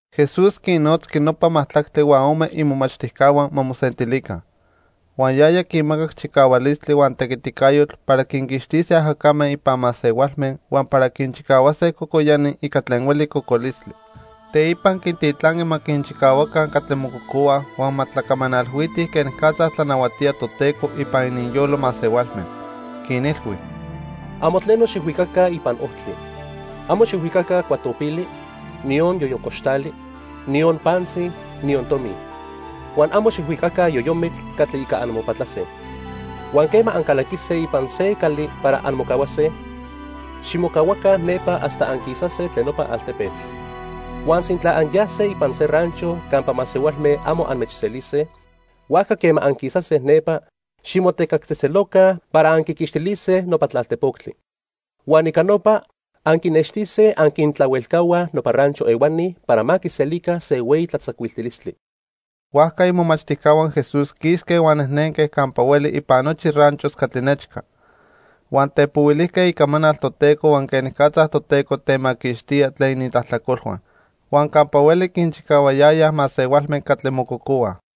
Jesús quinnotzqui nopa majtlactli huan ome imomachtijcahua ma mosentilica. Huan yaya quinmacac chicahualistli huan tequiticayotl para quinquixtise ajacame ipan masehualme huan para quinchicahuase cocoyani ica tlen hueli cocolistli. Teipa quintitlanqui ma quinchicahuaca catli mococohuaj huan ma tlacamanalhuitij quenicatza tlanahuatía Toteco ipan ininyolo masehualme. Quinilhui: —Amo tleno xijhuicaca ipan ojtli. Amo xijhuicaca cuatopili, niyon yoyoncoxtali, niyon pantzi, niyon tomi. Huan amo xijhuicaca yoyomitl catli ica anmopatlase. Huan quema ancalaquise ipan se cali para anmocahuase, ximocahuaca nepa hasta anquisase tlen nopa altepetl. Huan sintla anyase ipan se rancho campa masehualme amo anmechselise, huajca quema anquisase nepa, ximotecactzejtzeloca para anquiquixtilise nopa tlaltejpoctli. Huan ica nopa, anquinextise anquintlahuelcahuaj nopa rancho ehuani para ma quiselica se hueyi tlatzacuiltilistli. Huajca imomachtijcahua Jesús quisque huan nejnenque campa hueli ipan nochi ranchos catli nechca. Huan tepohuilijque icamanal Toteco huan quenicatza Toteco temaquixtía tlen inintlajtlacolhua. Huan campa hueli quinchicahuayayaj masehualme catli mococohuaj.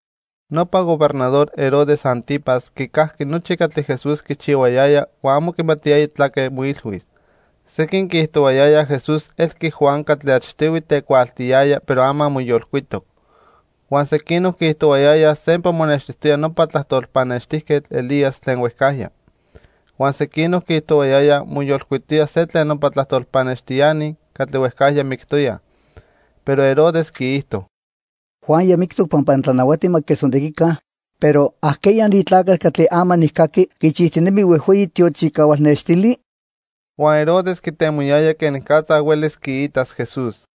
Nopa Gobernador Herodes 'Antipas quicajqui nochi catli Jesús quichihuayaya huan amo quimatiyaya tlaque moilhuis. Sequin quiijtohuayayaj Jesús elqui Juan catli achtihui tecuaaltiyaya pero ama moyolcuitoc. Huan sequinoc quiijtohuayayaj sempa monextijtoya nopa tlajtol pannextijquetl Elías tlen huejcajya. Huan sequinoc quiijtohuayayaj moyolcuitoya se tlen nopa tlajtol pannextiani catli huejcajya mictoyaj. Pero Herodes quiijto: —Juan ya mictoc pampa nitlanahuati ma quiquechtzontequica, pero ¿ajqueya ni tlacatl catli ama nijcaqui quichijtinemi huejhueyi tiochicahual nextili? Huan Herodes quitemoyaya quenicatza huelis quiitas Jesús.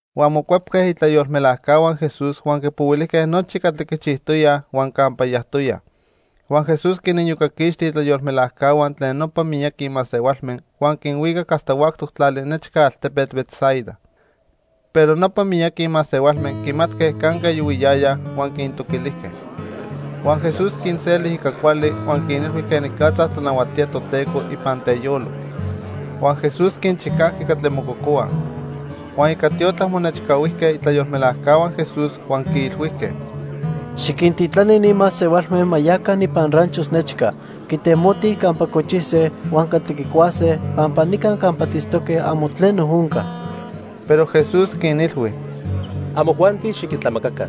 Huan mocuepque itlayolmelajcahua Jesús huan quipohuilijque nochi catli quichijtoyaj huan campa yajtoyaj. Huan Jesús quiniyocaquixti itlayolmelajcahua tlen nopa miyaqui masehualme huan quinhuicac hasta huactoc tlali nechca altepetl Betsaida. Pero nopa miyaqui masehualme quimatque canque yohuiyayaj huan quintoquilijque. Huan Jesús quinseli ica cuali huan quinilhui quenicatza tlanahuatía Toteco ipan teyolo. Huan Jesús quinchicajqui catli mococohuaj. Huan ica tiotlac monechcahuijque itlayolmelajcahua Jesús huan quiilhuijque: —Xiquintitlani ni masehualme ma yaca ipan ranchos nechca quitemotij campa cochise huan catli quicuase pampa nica campa tiitztoque amo tleno onca. Pero Jesús quinilhui: —Amojuanti xiquintlamacaca.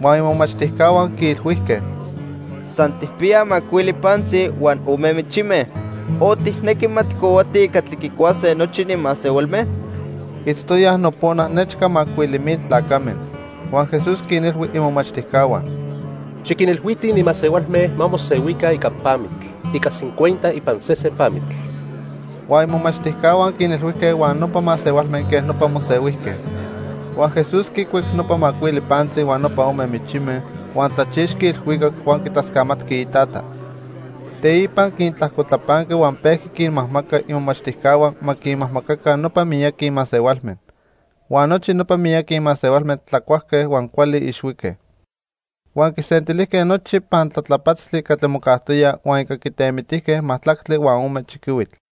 Huan imomachtijcahua quiilhuijque: —San tijpiyaj macuili pantzi huan ome michime, o ¿tijnequi ma tijcohuatij catli quicuase nochi ni masehualme? Itztoyaj nopona nechca macuili mil tlacame. Huan Jesús quinilhui imomachtijcahua: —Xiquinilhuitij ni masehualme ma mosehuica ica pamitl, ica cincuenta ipan sesen pamitl. Huan imomachtijcahua quinilhuijque huan nopa masehualme quej nopa mosehuijque. Huan Jesús quicuic nopa macuili pantzi huan nopa ome michime, huan tlachixqui ilhuicac huan quitlascamatqui iTata. Teipa quintlajcotlapanqui huan pejqui quinmajmaca imomachtijcahua ma quinmajmacaca nopa miyaqui masehualme. Huan nochi nopa miyaqui masehualme tlacuajque huan cuali ixhuique. Huan quisentilijque nochi pantlatlapatztli catli mocajtoya huan ica quitemitijque majtlactli huan ome chiquihuitl.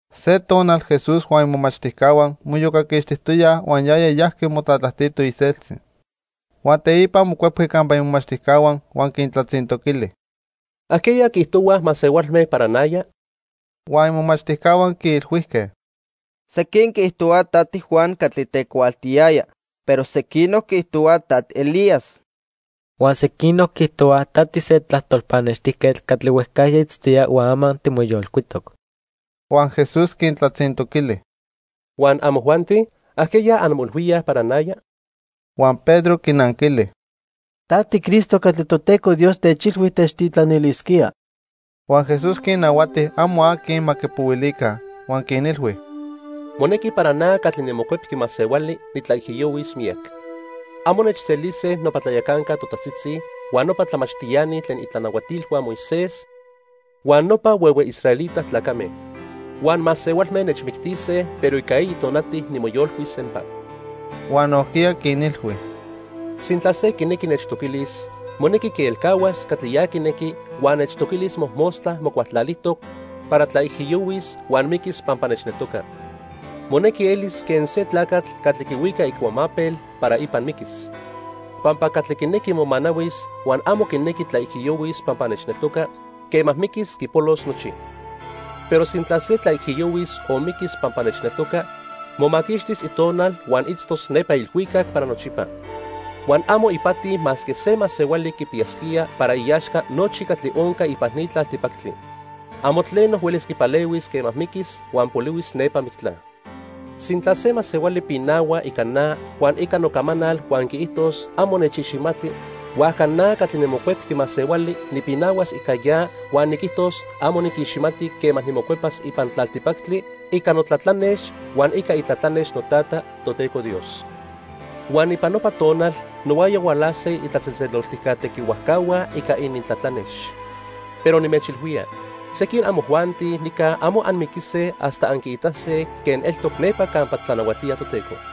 Se tonal Jesús huan imomachtijcahua moiyocaquixtijtoyaj huan yaya yajqui motlatlajtito iseltzi. Huan teipa mocuepqui campa imomachtijcahua huan quintlatzintoquili: —¿Ajqueya quiijtohuaj masehualme para naya? Huan imomachtijcahua quiilhuijque: Sequin quiijtohuaj ta tiJuan catli tecuaaltiyaya, pero sequinoc quiijtohuaj ta tiElías. Huan sequinoc quiijtohuaj ta tise tlajtol pannextijquetl catli huejcajya itztoya huan ama timoyolcuitoc. Huan Jesús quintlatzintoquili: —Huan, ¿amojuanti? ¿Ajqueya anmoilhuíaj para naya? Huan Pedro quinanquili: —Ta tiCristo catli Toteco Dios techilhui techtitlanilisquía. Huan Jesús quinnahuati amo aqui ma quipohuilica, huan quinilhui: —Monequi para na catli niMocuepqui Masehuali nitlaijiyohuis miyac. Amo nechselise nopa tlayacanca totajtzitzi, huan nopa tlamachtiani tlen itlanahuatilhua Moisés huan nopa huehue israelita tlacame. Huan masehualme nechmictise, pero ica eyi tonati nimoyolcuis sempa. Huan nojquiya quinilhui: —Sintla se quinequi nechtoquilis, monequi quielcahuas catli ya quinequi huan nechtoquilis mojmostla mocualtlalijtoc para tlaijiyohuis huan miquis pampa nechneltoca. Monequi elis quen se tlacatl catli quihuica icuamapel para ipan miquis. Pampa catli quinequi momanahuis huan amo quinequi tlaijiyohuis pampa nechneltoca, quema miquis quipolos nochi. Pero sintla se tlaijiyohuis o miquis pampa nechneltoca, momaquixtis itonal huan itztos nepa ilhuicac para nochipa. Huan amo ipati masque se masehuali quipiyasquía para iaxca nochi catli onca ipan ni tlaltipactli. Amo tleno huelis quipalehuis quema miquis huan polihuis nepa mictla. Sintla se masehuali pinahua ica na huan ica nocamanal huan quiijtos amo nechiximati, huajca na catli niMocuepqui Masehuali nipinahuas ica ya huan niquijtos amo niquiximati quema nimocuepas ipan tlaltipactli ica notlatlanex huan ica itlatlanex noTata, Toteco Dios. Huan ipan nopa tonal nohuaya hualase itlatzejtzeloltijca tequihuajcahua ica inintlatlanex. Pero nimechilhuía, sequin amojuanti nica amo anmiquise hasta anquiitase quen eltoc nepa campa tlanahuatía Toteco.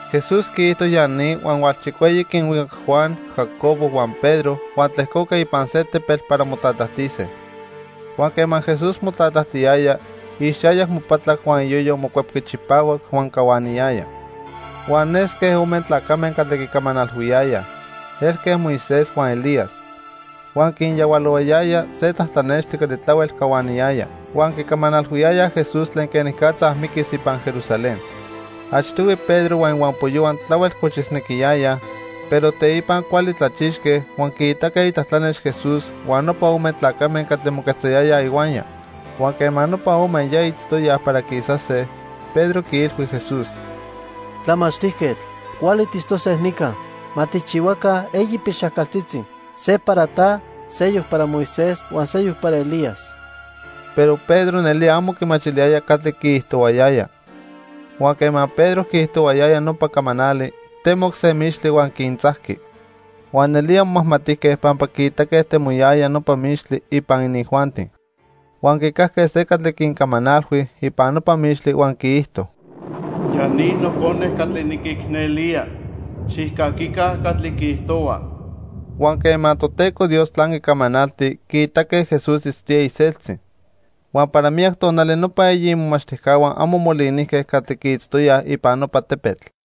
Jesús quiijto ya ni huan hualchicueyi quinhuicac Juan, Jacobo huan Pedro huan tlejcoque ipan se tepetl para motlatlajtise. Huan quema Jesús motlatlajtiyaya, ixayac mopatlac huan iyoyo mocuepqui chipahuac huan cahuaniyaya. Huan nesque ome tlacame catli quicamanalhuiyayaj. Elque Moisés huan Elías. Huan quinyahualohuayaya se tlatlanextli catli tlahuel cahuaniyaya. Huan quicamanalhuiyayaj Jesús tlen quenicatza miquis ipan Jerusalén. Achtihui Pedro huan ihuampoyohua tlahuel cochisnequiyayaj, pero teipa cuali tlachixque huan quiitaque itlatlanex Jesús huan nopa ome tlacame catli moquetzayayaj ihuaya. Huan quema nopa ome ya itztoyaj para quisase, Pedro quiilhui Jesús: —Tlamachtijquetl, cuali tiitztose nica. Ma tijchihuaca eyi pilxajcaltzitzi. Se para ta, seyoc para Moisés huan seyoc para Elías. Pero Pedro nelía amo quimachiliyaya catli quiijtohuayaya. Huan quema Pedro quiijtohuayaya nopa camanali, temoc se mixtli huan quintzajqui. Huan nelía momajmatijque pampa quiitaque temoyaya nopa mixtli ipan inijuanti. Huan quicajque se catli quincamanalhui ipan nopa mixtli huan quiijto: "Ya ni Nocone catli niquicnelía. Xijcaquica catli quiijtohua." Huan quema Toteco Dios tlanqui camanalti, quiitaque Jesús itztoya iseltzi. Huan para miyac tonali nopa eyi imomachtijcahua amo molinijque catli quiitztoyaj ipan nopa tepetl.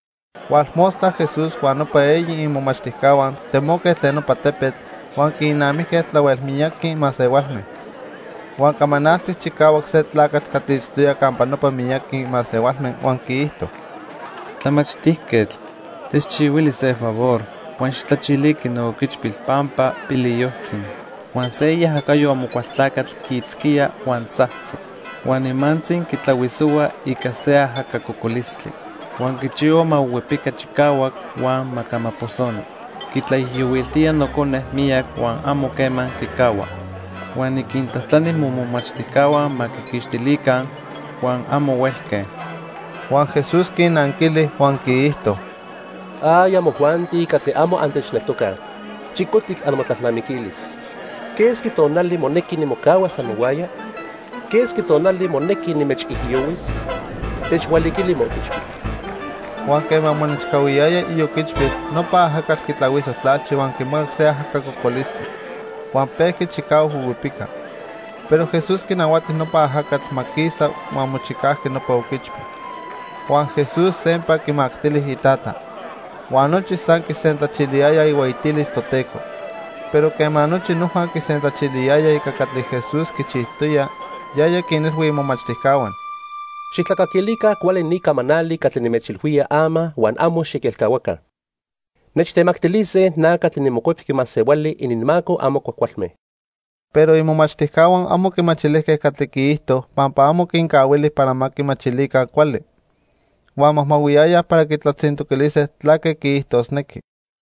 Hualmostla Jesús huan nopa eyi imomachtijcahua temoque tlen nopa tepetl, huan quinnamijque tlahuel miyaqui masehualme. Huan camanaltic chicahuac se tlacatl catli itztoya campa nopa miyaqui masehualme huan quiijto: —Tlamachtijquetl, techchihuili se favor huan xijtlachiliqui nooquichpil pampa piliyojtzi. Huan se iajacayo Amocualtlacatl quiitzquía, huan tzajtzi, huan nimantzi quitlahuisohua ica se ajaca cocolistli. Huan quichihua ma huihuipica chicahuac huan ma camaposoni. Quitlaijiyohuiltía nocone miyac huan amo quema quicahua. Huan niquintlajtlani momomachtijcahua ma quiquixtilica, huan amo huelque. Huan Jesús quinanquili huan quiijto: —¡Ay amojuanti catli amo antechneltocaj! Chicotic amotlalnamiquilis. ¿Quesqui tonali monequi nimocahuas amohuaya? ¿Quesqui tonali monequi nimechijiyohuis? Techhualiquili mooquichpil. Huan quema monechcahuiyaya ioquichpil, nopa ajacatl quitlahuiso tlalchi huan quimacac se ajaca cocolistli. Huan pejqui chicahuac huihuipica. Pero Jesús quinahuati nopa ajacatl ma quisa huan mochicajqui nopa oquichpil. Huan Jesús sempa quimactili itata. Huan nochi san quisentlachiliyayaj ihueyitilis Toteco. Pero quema nochi noja quisentlachiliyayaj ica catli Jesús quichijtoya, yaya quinilhui imomachtijcahua: —Xijtlacaquilica cuali ni camanali catli nimechilhuía ama huan amo xiquelcahuaca. Nechtemactilise na catli niMocuepqui Masehuali ininmaco amo cuajcualme. Pero imomachtijcahua amo quimachilijque catli quiijto pampa amo quincahuili para ma quimachilica cuali. Huan majmahuiyayaj para quitlatzintoquilise tlaque quiijtosnequi.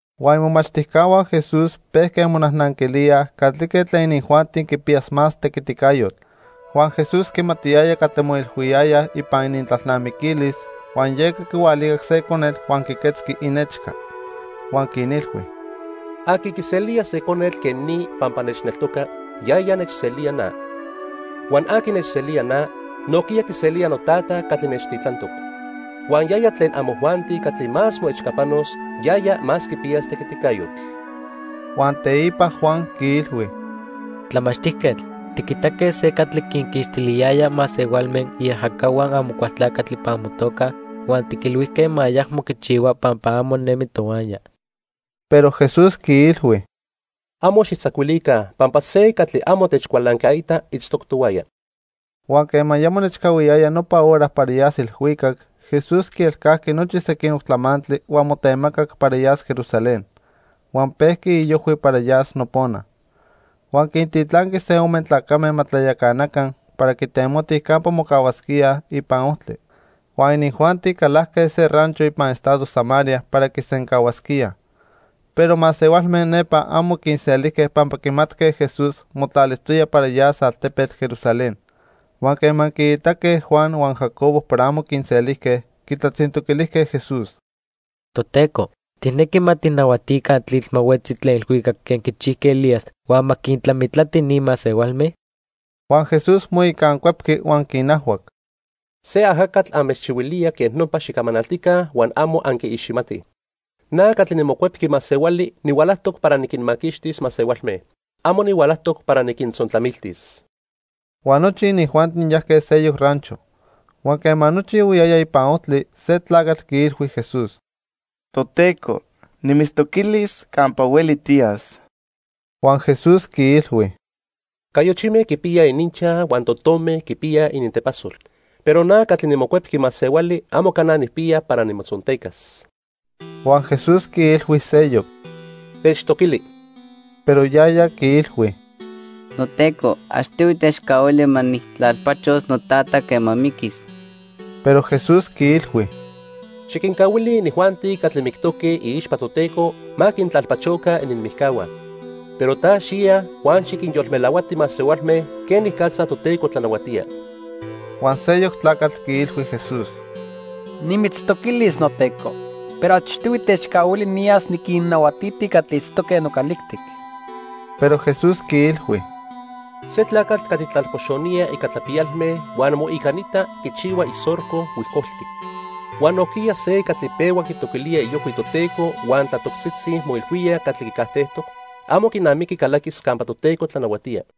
Huan imomachtijcahua Jesús pejque monajnanquilíaj catlique tlen inijuanti quipiyas más tequiticayotl. Huan Jesús quimatiyaya catli moilhuiyayaj ipan inintlalnamiquilis, huan yeca quihualicac se conetl huan quiquetzqui inechca. Huan quinilhui: —Aqui quiselía se conetl quen ni pampa nechneltoca, yaya nechselía na. Huan aqui nechselía na, nojquiya quiselía noTata catli nechtitlantoc. Huan yaya tlen amojuanti catli más moechcapanos, yaya más quipiyas tequiticayotl. Huan teipa Juan quiilhui: —Tlamachtijquetl, tiquitaque se catli quinquixtiliyaya masehualme iajacahua Amocualtlacatl ipan motoca huan tiquilhuijque ma ayacmo quichihua pampa amo nemi tohuaya. Pero Jesús quiilhui: —Amo xijtzacuilica pampa se catli amo techcualancaita itztoc tohuaya. Huan quema ya monechcahuiyaya nopa hora para yas ilhuicac, Jesús quielcajqui nochi sequinoc tlamantli huan motemacac para yas Jerusalén. Huan pejqui iojhui para yas nopona. Huan quintitlanqui se ome tlacame ma tlayacanaca para quitemotij campa mocahuasquíaj ipan ojtli. Huan inijuanti calajque se rancho ipan estado Samaria para quisencahuasquíaj. Pero masehualme nepa amo quinselijque pampa quimatque Jesús motlalijtoya para yas altepetl Jerusalén. Huan quema quiitaque Juan huan Jacobo para amo quinselijque, quitlatzintoquilijque Jesús: —Toteco, ¿tijnequi ma tijnahuatica tlitl ma huetzi tlen ilhuicac quen quichijqui Elías huan ma quintlamitlati ni masehualme? Huan Jesús moicancuepqui huan quinajhuac: —Se ajacatl anmechchihuilía quej nopa xicamanaltica huan amo anquiiximatij. Na catli niMocuepqui Masehuali nihualajtoc para niquinmaquixtis masehualme. Amo nihualajtoc para niquintzontlamiltis. Huan nochi inijuanti yajque seyoc rancho. Huan quema nochi yohuiyayaj ipan ojtli, se tlacatl quiilhui Jesús: —Toteco, nimitztoquilis campa hueli tiyas. Huan Jesús quiilhui: —Cayochime quipiyaj ininchaj huan totome quipiyaj inintepasol, pero na catli niMocuepqui Masehuali amo cana nijpiya para nimotzontecas. Huan Jesús quiilhui seyoc: —Techtoquili. Pero yaya quiilhui: —NoTeco, achtihui techcahuili ma nijtlalpachos notata quema miquis. Pero Jesús quiilhui: —Xiquincahuili inijuanti catli mictoque iixpa Toteco ma quintlalpachoca ininmijcahua. Pero ta xiya huan xiquinyolmelahuati masehualme quenicatza Toteco tlanahuatía. Huan seyoc tlacatl quiilhui Jesús: —Nimitztoquilis, noTeco, pero achtihui techcahuili niyas niquinnahuatiti catli itztoque nocalijtic. Pero Jesús quiilhui: —Se tlacatl catli tlalpoxonía ica tlapiyalme huan moicanita quichihua isorco huijcoltic, huan nojquiya se catli pehua quitoquilía iojhui Toteco huan tlatoctzitzi moilhuía catli quicajtejtoc, amo quinamiqui calaquis campa Toteco tlanahuatía.